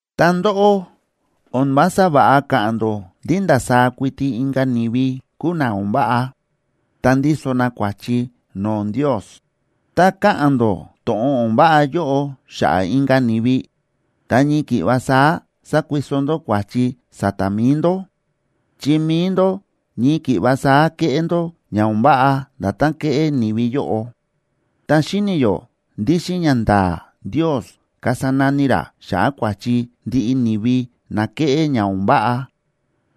Ta ndóꞌó, o̱n vása va̱ꞌa káꞌa̱n ndó ndí ndasaá kuiti inka̱ ni̱vi kúu na o̱n váꞌa, ta ndíso na kua̱chi no̱o̱ Ndios. Tá káꞌa̱n ndó to̱ꞌon o̱n váꞌa yóꞌo xa̱ꞌa̱ inka̱ ni̱vi, ta ñii ki̱ꞌva saá sákuiso ndó kua̱chi sa̱ta̱ mi̱i ndó, chi mi̱i ndó ñii ki̱ꞌva saá kéꞌé ndó ña o̱n váꞌa nda̱tán kéꞌé ni̱vi yóꞌo. Ta xíni̱ yó ndí xíꞌin ñanda̱a̱ Ndios kasa nani ra xa̱ꞌa̱ kua̱chi ndiꞌi ni̱vi na kéꞌé ña o̱n váꞌa.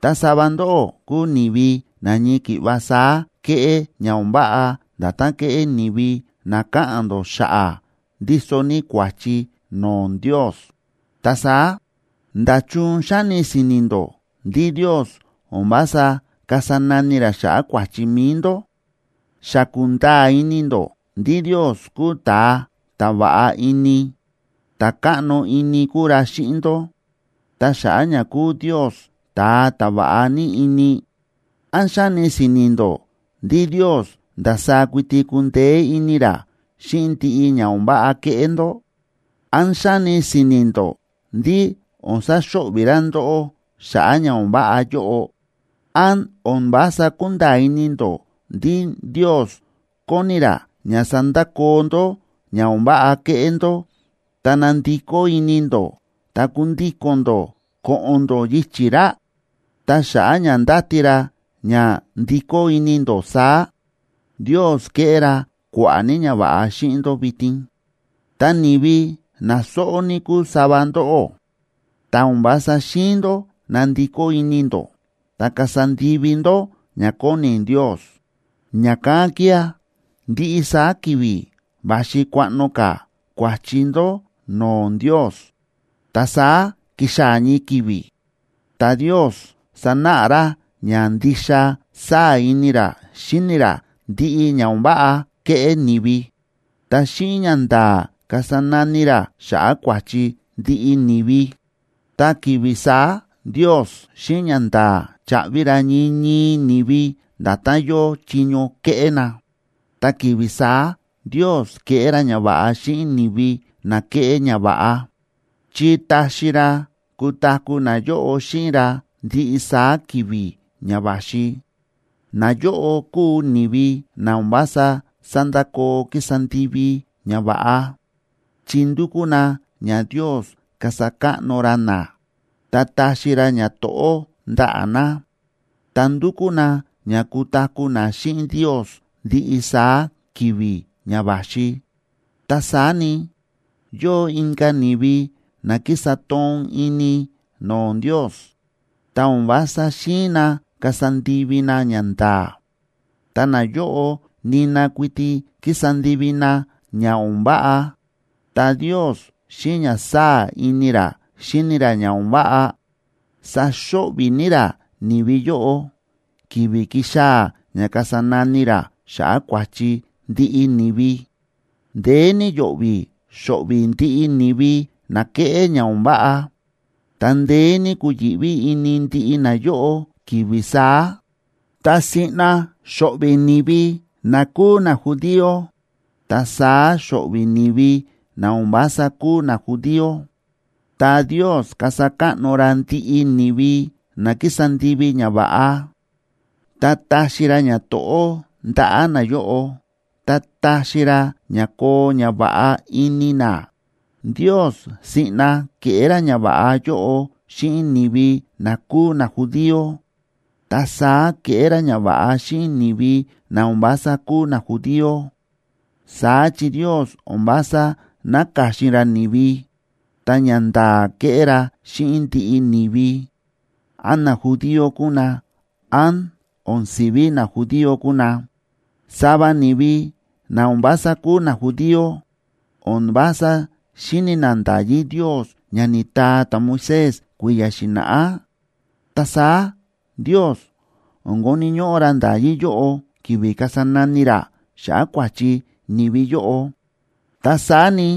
Ta sava ndóꞌó kúu ni̱vi na ñii ki̱ꞌva saá kéꞌé ña o̱n váꞌa nda̱tán kéꞌé ni̱vi na káꞌa̱n ndó xa̱ꞌa̱ ndíso ní kua̱chi no̱o̱ Ndios. Ta saá, ¿nda̱chun xáni si̱ni̱ ndó ndí Ndios o̱n vása kasa nani ra xa̱ꞌa̱ kua̱chi mi̱i ndó? Xa kúnda̱a̱ ini ndó ndí Ndios kúu ta̱a ta̱ va̱ꞌa ini, ta̱ káꞌno ini kúu ra xíꞌin ndó. Ta xa̱ꞌa̱ ña kúu Ndios ta̱a ta̱ va̱ꞌa ní ini, ¿án xáni si̱ni̱ ndó ndí Ndios ndasaá kuiti kundeé ini ra xíꞌin ndiꞌi ña o̱n váꞌa kéꞌé ndó? ¿Án xáni si̱ni̱ ndó ndí o̱n saxo̱ꞌvi̱ ra ndóꞌó xa̱ꞌa̱ ña o̱n váꞌa yóꞌo? ¿Án o̱n vása kúnda̱a̱ ini ndó ndí Ndios kóni ra ña sandakoo ndó ña o̱n váꞌa kéꞌé ndó, ta nandikó ini ndó, ta kundíko̱n ndó ko̱ꞌo̱n ndó yichi̱ ra? Ta xa̱ꞌa̱ ña ndáti ra ña ndikó ini ndó saá, Ndios kéꞌé ra kua̱ꞌa̱ ní ñava̱ꞌa xíꞌin ndó vitin. Ta ni̱vi na sóꞌó ní kúu sava ndóꞌó, ta o̱n vása xi̱in ndó nandikó ini ndó ta kasa ndivi ndó ña kóni Ndios. Ña̱kán kía̱ ndiꞌi saá ki̱vi̱ va̱xi kuaꞌno ka̱ kua̱chi ndó no̱o̱ Ndios. Ta saá kixaa̱ ñii ki̱vi̱, ta Ndios sanáꞌa ra ña ndixa sáa̱ ini ra xíni ra ndiꞌi ña o̱n váꞌa kéꞌé ni̱vi, ta xíꞌin ñanda̱a̱ kasa nani ra xa̱ꞌa̱ kua̱chi ndiꞌi ni̱vi. Ta ki̱vi̱ saá Ndios xíꞌin ñanda̱a̱ chaꞌvi ra ñii ñii ni̱vi nda̱tán yóo chiño ke̱ꞌé na. Ta ki̱vi̱ saá Ndios keꞌé ra ñava̱ꞌa xíꞌin ni̱vi na ke̱ꞌé ñava̱ꞌa, chi taxi ra kutaku̱ nayóꞌo xíꞌin ra ndiꞌi saá ki̱vi̱ ña va̱xi. Nayóꞌo kúu ni̱vi na o̱n vása sándakoo kísa ndivi ñava̱ꞌa, chi ndúkú na ña Ndios kasa káꞌno ra na, ta taxi ra ñato̱ꞌó ndaꞌa̱ na, ta ndúkú na ña kutaku̱ na xíꞌin Ndios ndiꞌi saá ki̱vi̱ ña va̱xi. Ta saá ni, yóo inka̱ ni̱vi na kísa toon ini no̱o̱ Ndios, ta o̱n vása xi̱in na kasa ndivi na ñanda̱a̱, ta nayóꞌo nina kuiti kísa ndivi na ña o̱n váꞌa. Ta Ndios xíꞌin ña sáa̱ ini ra xíni ra ña o̱n váꞌa, saxo̱ꞌvi̱ ní ra ni̱vi yóꞌo, ki̱vi̱ kixaa̱ ña kasa nani ra xa̱ꞌa̱ kua̱chi ndiꞌi ni̱vi. Ndeé ní yo̱ꞌvi̱ xo̱ꞌvi̱ ndiꞌi ni̱vi na kéꞌé ña o̱n váꞌa, ta ndeé ní kuyi̱ꞌví ini ndiꞌi nayóꞌo ki̱vi̱ saá. Ta siꞌna xo̱ꞌvi̱ ni̱vi na kúu najudío, ta saá xo̱ꞌvi̱ ni̱vi na o̱n vása kúu najudío.a Ta Ndios kasa káꞌno ra ndiꞌi ni̱vi na kísa ndivi ñava̱ꞌa, ta taxi ra ñato̱ꞌó ndaꞌa̱ nayóꞌo, ta taxi ra ña koo ñava̱ꞌa ini na. Ndios siꞌna keꞌé ra ñava̱ꞌa yóꞌo xíꞌin ni̱vi na kúu najudío, ta saá keꞌé ra ñava̱ꞌa xíꞌin ni̱vi na o̱n vása kúu najudío. Saá chi Ndios o̱n vása náka̱xin ra ni̱vi, ta ñanda̱a̱ kéꞌé ra xíꞌin ndiꞌi ni̱vi, án najudío kúu na, án o̱n si̱ví najudío kúu na. Sava ni̱vi na o̱n vása kúu najudío o̱n vása xíni̱ na nda̱yí Ndios ña ni̱taa ta̱Moisés kui̱ya̱ xi̱na̱ꞌá. Ta saá Ndios o̱n koni̱ ñóꞌó ra nda̱yí yóꞌo ki̱vi̱ kasa nani ra xa̱ꞌa̱ kua̱chi ni̱vi yóꞌo. Ta saá ni,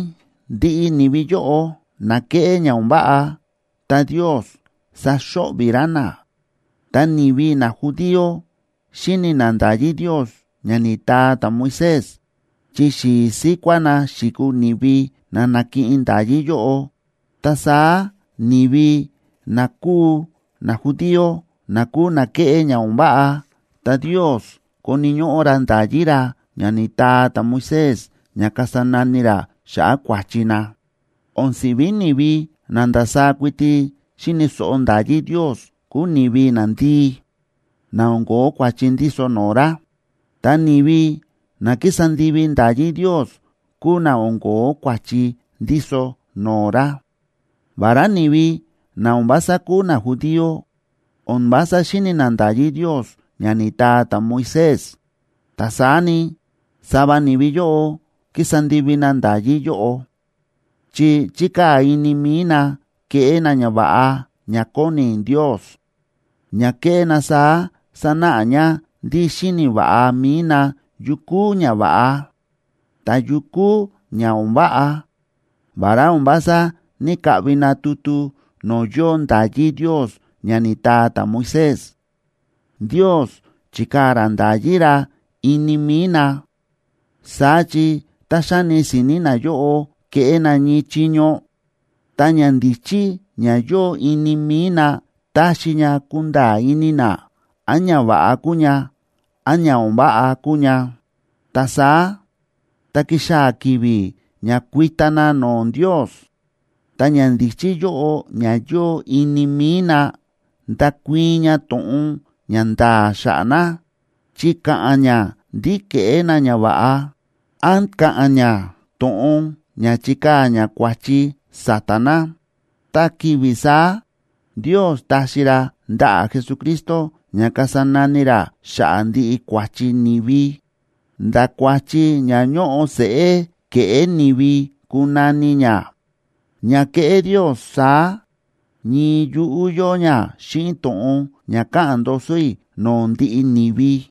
ndiꞌi ni̱vi yóꞌo na kéꞌé ña o̱n váꞌa, ta Ndios saxo̱ꞌvi̱ ra na. Ta ni̱vi najudío, xíni̱ na nda̱yí Ndios ña ni̱taa ta̱Moisés, chi xi̱i̱ síkuá na xi̱kuu ni̱vi na na̱kiꞌin nda̱yí yóꞌo. Ta saá ni̱vi na kúu najudío na kúu na kéꞌé ña o̱n váꞌa, ta Ndios koni̱ ñóꞌó ra nda̱yí ra ña ni̱taa ta̱Moisés ña kasa nani ra xa̱ꞌa̱ kua̱chi na. O̱n si̱ví ni̱vi na ndasaá kuiti xíni̱ so̱ꞌo nda̱yí Ndios kúu ni̱vi nandii, na o̱n ko̱ó kua̱chi ndíso no̱o̱ ra, ta ni̱vi na kísa ndivi nda̱yí Ndios kúu na o̱n ko̱ó kua̱chi ndíso no̱o̱ ra. Vará ni̱vi na o̱n vása kúu najudío o̱n vása xíni̱ na nda̱yí Ndios ña ni̱taa ta̱Moisés, ta saá ni, sava ni̱vi yóꞌo kísa ndivi na nda̱yí yóꞌo, chi chíkaa̱ ini mi̱i na keꞌé na ñava̱ꞌa ña kóni Ndios. Ña kéꞌé na saá sánáꞌa ña ndí xíni̱ va̱ꞌa mi̱i na yu kúu ñava̱ꞌa, ta yu kúu ña o̱n váꞌa. Vará o̱n vása ní‑kaꞌvi na tutu no̱o̱ yóo nda̱yí Ndios ña ni̱taa ta̱Moisés, Ndios chi̱kaa̱ ra nda̱yí ra ini mi̱i na. Saá chi tá xáni si̱ni̱ nayóꞌo keꞌé na ñii chiño, ta ñandíchí ña yóo ini mi̱i na táxi ña kunda̱a̱ ini na án ñava̱ꞌa kúu ña, án ña o̱n váꞌa kúu ña. Ta saá, tá kixaa̱ ki̱vi̱ ña kuita na no̱o̱ Ndios, ta ñandíchí yóꞌo ña yóo ini mi̱i na, ndakuii̱n ña to̱ꞌon ña nda̱a̱ xa̱ꞌa̱ na, chi ka̱ꞌa̱n ña ndí ke̱ꞌé na ñava̱ꞌa, án ka̱ꞌa̱n ña to̱ꞌon ña chikaa̱ ña kua̱chi sa̱ta̱ na. Ta ki̱vi̱ saá, Ndios taxi ra ndaꞌa̱ Jesucristo ña kasa nani ra xa̱ꞌa̱ ndiꞌi kua̱chi ni̱vi, nda̱ kua̱chi ña ñóꞌo seꞌé ke̱ꞌé ni̱vi kunani ña. Ña keꞌé Ndios saá, ñii yuꞌú yóo ña xíꞌin to̱ꞌon ña káꞌa̱n ndoso i̱ no̱o̱ ndiꞌi ni̱vi.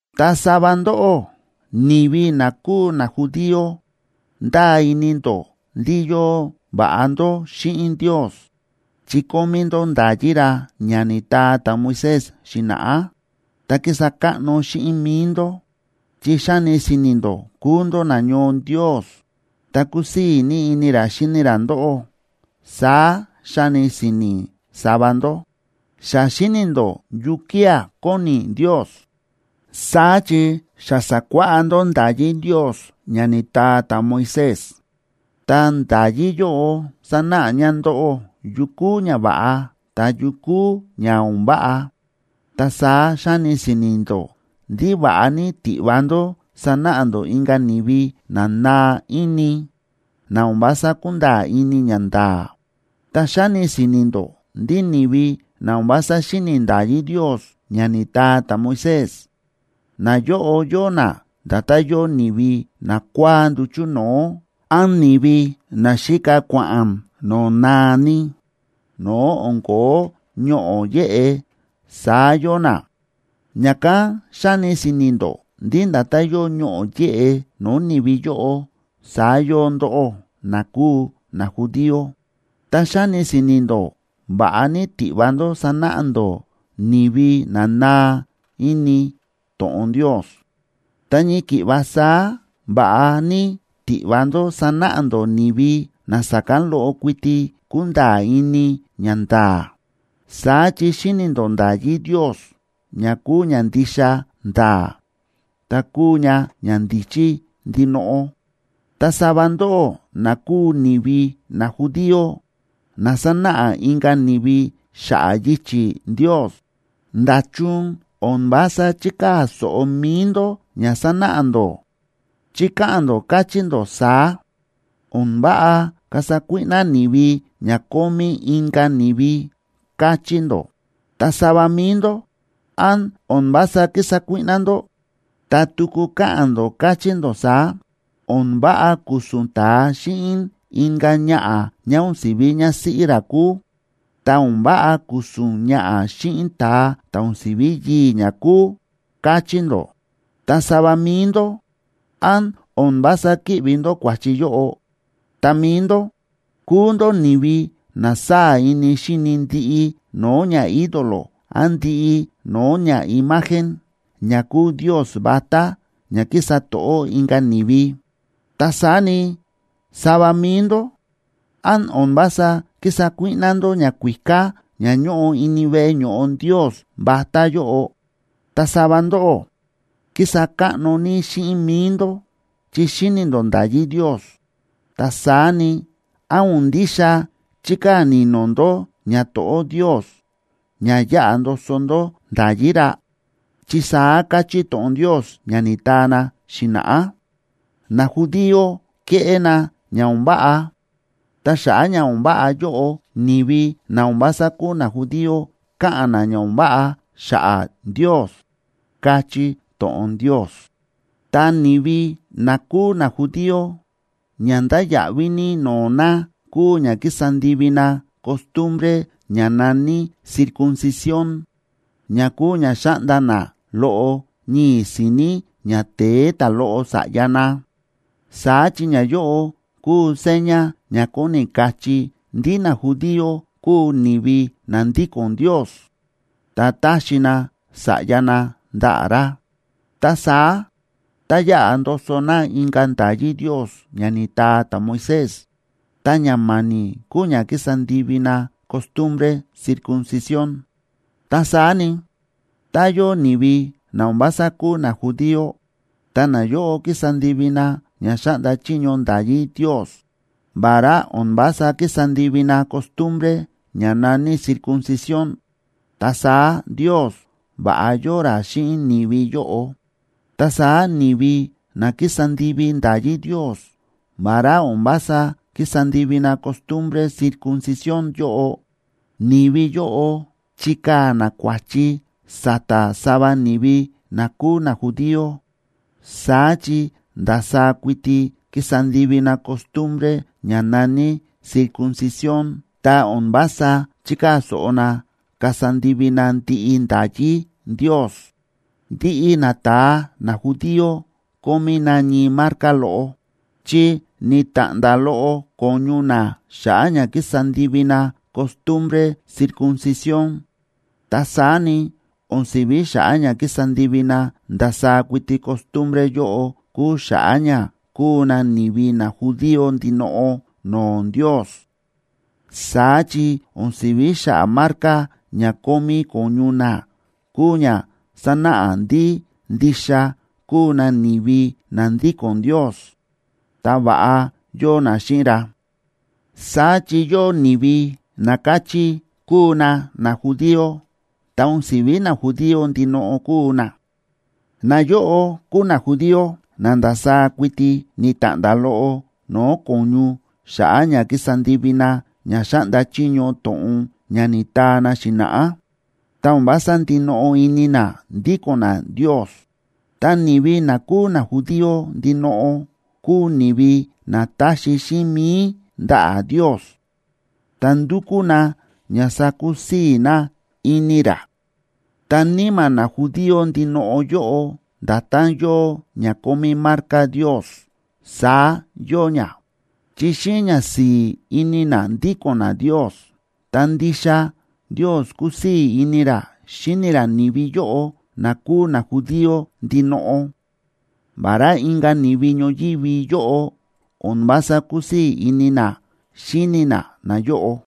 Ta sava ndóꞌó, ni̱vi na kúu najudío ndáa ini ndó ndí yóo va̱ꞌa ndó xíꞌin Ndios chi kómí ndó nda̱yí ra ña ni̱taa ta̱Moisés xi̱na̱ꞌá. Ta kísa káꞌno xíꞌin mi̱i ndó, chi xáni si̱ni̱ ndó kúu ndó nañoo Ndios, ta kúsii̱ ní ini ra xíni ra ndóꞌó, saá xáni si̱ni̱ sava ndó. Xa xíni̱ ndó yukía̱ kóni Ndios, saá chi xa sa̱kuáꞌá ndó nda̱yí Ndios ña ni̱taa ta̱Moisés. Ta nda̱yí yóꞌo sánáꞌa ña ndóꞌó yu kúu ñava̱ꞌa, ta yu kúu ña o̱n váꞌa. Ta saá xáni si̱ni̱ ndó ndí va̱ꞌa ní tiꞌva ndó sanáꞌa ndó inka̱ ni̱vi na naa ini, na o̱n vása kúnda̱a̱ ini ñanda̱a̱. Ta xáni si̱ni̱ ndó ndí ni̱vi na o̱n vása xíni̱ nda̱yí Ndios ña ni̱taa ta̱Moisés, nayóꞌo yóo na nda̱tán yóo ni̱vi nakua̱á nduchu̱ no̱o̱, án ni̱vi na xíka kua̱ꞌa̱n no̱o̱ naa ní, no̱o̱ o̱n ko̱ó ñoꞌo̱ yéꞌe, saá yóo na. Ña̱kán xáni si̱ni̱ ndó ndí nda̱tán yóo ñoꞌo̱ yéꞌe no̱o̱ ni̱vi yóꞌo, saá yóo ndóꞌó, na kúu najudío. Ta xáni si̱ni̱ ndó va̱ꞌa ní tiꞌva ndó sanáꞌa ndó ni̱vi na naa ini to̱ꞌon Ndios, ta ñii ki̱ꞌva saá va̱ꞌa ní tiꞌva ndó sanáꞌa ndó ni̱vi na sa̱kán loꞌo kuiti kúnda̱a̱ ini ñanda̱a̱. Saá chi xíni̱ ndó nda̱yí Ndios, ña kúu ña ndixa nda̱a̱, ta kúu ña ñandíchí ndinoꞌo. Ta sava ndóꞌó, na kúu ni̱vi najudío, na sánáꞌa inka̱ ni̱vi xa̱ꞌa̱ yichi̱ Ndios, ¿nda̱chun o̱n vása chíkaa̱ so̱ꞌo mi̱i ndó ña sánáꞌa ndó? Chi káꞌa̱n ndó, káchí ndó saá: “O̱n váꞌa kasa kuíꞌná ni̱vi ña kómí inka̱ ni̱vi”, káchí ndó. Ta sava mi̱i ndó, ¿án o̱n vása kísa kuíꞌná ndó? Ta tuku káꞌa̱n ndó, káchí ndó saá: “O̱n váꞌa ku̱su̱n ta̱a xíꞌin inka̱ ñaꞌa̱ ñá o̱n si̱ví ñásíꞌí ra kúu. Ta o̱n váꞌa ku̱su̱n ñaꞌa̱ xíꞌin ta̱a ta̱ o̱n si̱ví yii̱ ñá kúu”, káchí ndó. Ta sava mi̱i ndó, ¿án o̱n vása kíꞌvi ndó kua̱chi yóꞌo? Ta mi̱i ndó, kúu ndó ni̱vi na sáa̱ ini xíni ndiꞌi no̱o̱ ñaídolo án ndiꞌi no̱o̱ ñaimagen, ña kúu ndios vatá ña kísa to̱ꞌó inka̱ ni̱vi. Ta saá ni, sava mi̱i ndó, ¿án o̱n vása kísa kuíꞌná ndó ñakuíká ña ñóꞌo ini veꞌe ño̱ꞌo ndios vatá yóꞌo? Ta sava ndóꞌó, kísa káꞌno ní xíꞌin mi̱i ndó chi xíni̱ ndó nda̱yí Ndios. Ta saá ni, ¿án o̱n ndixa chíkaa̱ ni̱no̱ ndó ñato̱ꞌó Ndios, ña yáꞌa ndoso ndó nda̱yí ra? Chi saá káchí to̱ꞌon Ndios ña ni̱taa na xi̱na̱ꞌá: “Najudío kéꞌé na ña o̱n váꞌa, ta xa̱ꞌa̱ ña o̱n váꞌa yóꞌo, ni̱vi na o̱n vása kúu najudío káꞌa̱n na ña o̱n váꞌa xa̱ꞌa̱ Ndios”, káchí to̱ꞌon Ndios. Ta ni̱vi na kúu najudío, ña ndáya̱ꞌví ní no̱o̱ na kúu ña ki̱sa ndivi na costumbre ña na̱ní circuncisión, ña kúu ña xáꞌnda na loꞌo ñii̱ si̱ni̱ ñate̱e ta̱loꞌo sa̱ꞌya na. Saá chi ñayóꞌo kúu seña ña kóni kachí ndí najudío kúu ni̱vi na ndíko̱n Ndios, ta táxi na sa̱ꞌya na ndaꞌa̱ ra. Ta saá, tá yaꞌa ndoso na inka̱ nda̱yí Ndios ña ni̱taa ta̱Moisés, ta ña ma̱ni̱ kúu ña ki̱sa ndivi na costumbre circuncisión. Ta saá ni, tá yóo ni̱vi na o̱n vása kúu najudío, tá nayóꞌo kísa ndivi na ña xáꞌnda chiño nda̱yí Ndios, vará o̱n vása kísa ndivi na costumbre ña na̱ní circuncisión, ta saá Ndios va̱ꞌa yóo ra xíꞌin ni̱vi yóꞌo. Ta saá ni̱vi na kísa ndivi nda̱yí Ndios, vará o̱n vása kísa ndivi na costumbre circuncisión yóꞌo, ni̱vi yóꞌo chikaa̱ na kua̱chi sa̱ta̱ sava ni̱vi na kúu najudío. Saá chi ndasaá kuiti kísa ndivi na costumbre ña na̱ní circuncisión, ta o̱n vása chíkaa̱ so̱ꞌo na kasa ndivi na ndiꞌi nda̱yí Ndios. Ndiꞌi nata̱a najudío kómí na ñii marca loꞌo, chi ni̱ta̱ꞌnda̱ loꞌo ko̱ñu na xa̱ꞌa̱ ña ki̱sa ndivi na costumbre circuncisión. Ta saá ni, o̱n si̱ví xa̱ꞌa̱ ña kísa ndivi na ndasaá kuiti costumbre yóꞌo kúu xa̱ꞌa̱ ña kúu na ni̱vi najudío ndinoꞌo no̱o̱ Ndios. Saá chi o̱n si̱ví xa̱ꞌa̱ marca ña kómí ko̱ñu na kúu ña sánáꞌa ndí ndixa kúu na ni̱vi na ndíko̱n Ndios, ta va̱ꞌa yóo na xíꞌin ra. Saá chi yóo ni̱vi na káchí kúu na najudío, ta o̱n si̱ví najudío ndinoꞌo kúu na. Nayóꞌo kúu najudío na ndasaá kuiti ni̱ta̱ꞌnda̱ loꞌo no̱o̱ ko̱ñu xa̱ꞌa̱ ña ki̱sa ndivi na ña xáꞌnda chiño to̱ꞌon ña ni̱taa na xi̱na̱ꞌá, ta o̱n vása ndinoꞌo ini na ndíko̱n na Ndios. Ta ni̱vi na kúu najudío ndinoꞌo kúu ni̱vi na táxi xíꞌin mi̱i ndaꞌa̱ Ndios, ta ndúkú na ña sakusii̱ na ini ra. Ta níma̱ najudío ndinoꞌo yóꞌo nda̱tán yóo ña kómí marca Ndios, saá yóo ña, chi xíꞌin ñasi̱i̱ ini na ndíko̱n na Ndios. Ta ndixa Ndios kúsii̱ ini ra xíni ra ni̱vi yóꞌo na kúu najudío ndinoꞌo, vará inka̱ ni̱vi ñoyívi yóꞌo o̱n vása kúsii̱ ini na xíni na nayóꞌo.